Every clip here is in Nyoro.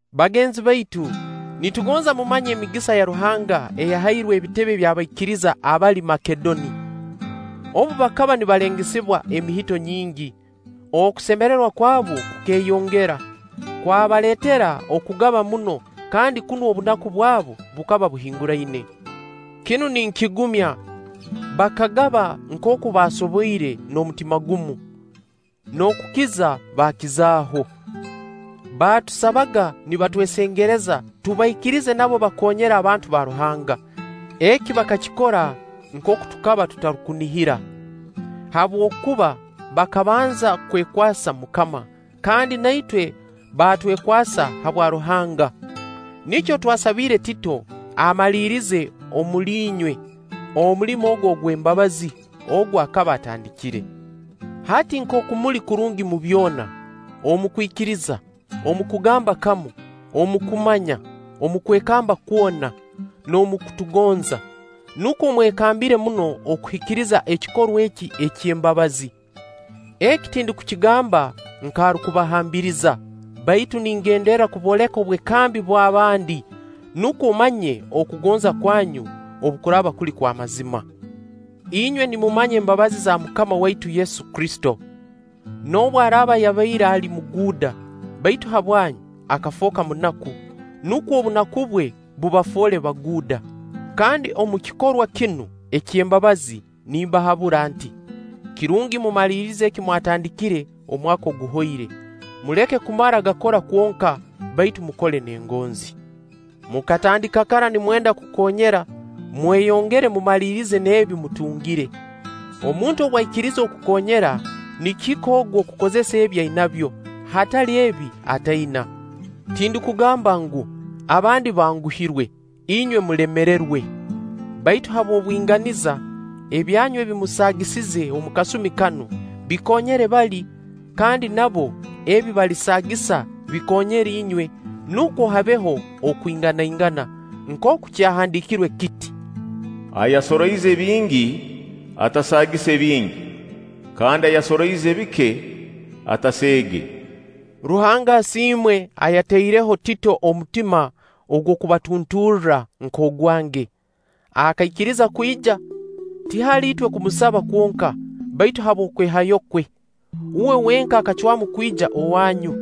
Bagenzi baitu, nitugonza mumanye emigisa ya Ruhanga eyahairwe ebitebe by'abaikiriza abali Makedoni. Obu bakaba nibalengesebwa emihito nyingi, okusemererwa kwabu kukeeyongera, kwabaleetera okugaba muno kandi kunu obunaku bwabu bukaba buhinguraine. Kinu ninkigumya: bakagaba nkooku baasoboire n'omutima gumu, n'okukiza baakizaaho. Baatusabaga nibatwesengereza tubaikirize nabo bakoonyere abantu ba Ruhanga eki bakakikora nkooku tukaba tutarukunihira, habwokuba bakabanza kwekwasa MUKAMA, kandi na itwe baatwekwasa habwa Ruhanga. Nikyo twasabiire Tito amalirize omuli inywe omulimo ogu ogw'embabazi, ogu akaba atandikire. hati nkooku muli kurungi mu byona, omu kwikiriza, omu kugamba kamu, omu kumanya, omu kwekamba kwona, n'omu kutugonza, nukwo mwekambire muno okuhikiriza ekikorwa eki eky'embabazi. Eki tindukukigamba nk'arukubahambiriza, baitu ningenderra kubooleka obwekambi bw'abandi, nukwo mmanye okugonza kwanyu obu kuraaba kuli kw'amazima. Inywe nimumanya embabazi za MUKAMA waitu Yesu Kristo. Noobu araaba yabaire ali muguuda, baitu habwanyu akafooka munaku, nukwo obunaku bwe bubafoole baguuda. Kandi omu kikorwa kinu eky'embabazi nimbahabura nti: kirungi mumalirize eki mwatandikire omwaka oguhoire, muleke kumara gakora kwonka baitu mukole n'engonzi. Mukatandika kara nimwenda kukoonyera, mweyongere mumalirize n'ebi mutungire. Omuntu obu aikiriiza okukoonyera, nikihika ogu okukozesa ebi ainabyo, hatali ebi ataina. Tindukugamba ngu, abandi banguhirwe, inywe mulemererwe. Baitu habw'obwinganiza: ebyanyu ebi musaagisize omu kasumi kanu, bikoonyere bali; kandi nabo ebi balisaagisa bikoonyere inywe, nukwo habeho okwinganaingana. Nkooku kyahandiikirwe kiti: “Ayasoroize bingi, atasaagise bingi; kandi ayasoroize bike, ataseege.” Ruhanga asiimwe ayatairemu Tito omutima ogw'okubatunturra nk'ogwange. Akaikiriza kwija, tihali itwe kumusaba kwonka, baitu habw'okwehayo kwe. Uwe wenka akacwamu kwija owanyu.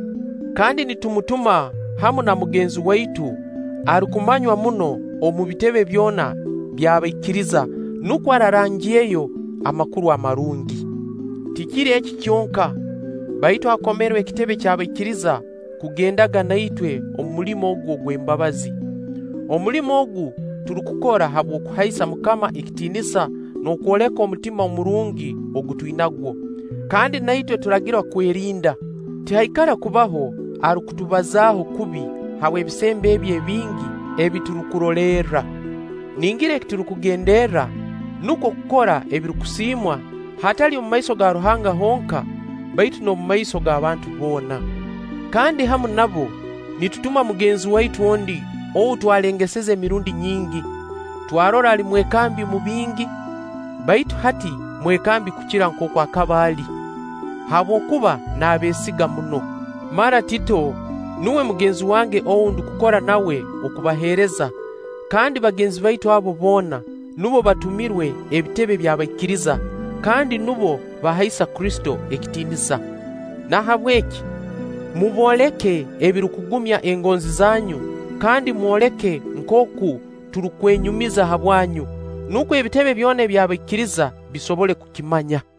Kandi nitumutuma hamu na mugenzi waitu arukumanywa muno omu bitebe byona by'abaikiriza, nukwo arangirreyo Amakuru Amarungi. Tikiri eki kyonka, baitu akomerwe ebitebe by'abaikiriza kugendaga na itwe omu mulimo ogu ogw'embabazi. Omulimo ogu turukukora habw'okuhaisa MUKAMA ekitiinisa n'okwoleka omutima omurungi ogu twinagwo. Kandi na itwe turagirwa kwerinda, tihaikara kubaho arukutubazaaho kubi habw'ebisembo ebi ebingi ebi turukurolerra. Ningira eki turukugenderra nukwo kukora ebirukusiimwa, hatali omu maiso ga Ruhanga honka, baitu n'omu maiso g'abantu boona. Kandi hamu nabo nitutuma mugenzi waitu ondi ou twalengeseze emirundi nyingi, twarora ali mwekambi omu bingi; baitu hati mwekambi kukira nkooku akaba ali, habwokuba naabeesiga muno. Mara Tito, nuwe mugenzi wange ou ndukukora nawe okubaheereza; kandi bagenzi baitu abo boona, nubo batumirwe ebitebe by'abaikiriza, kandi nubo bahaisa Kristo ekitiinisa. Nahabweki mubooleke ebirukugumya engonzi zanyu kandi mwoleke nkooku turukwenyumiza habwanyu, nukwo ebitebe byona by'abaikiriza bisobole kukimanya.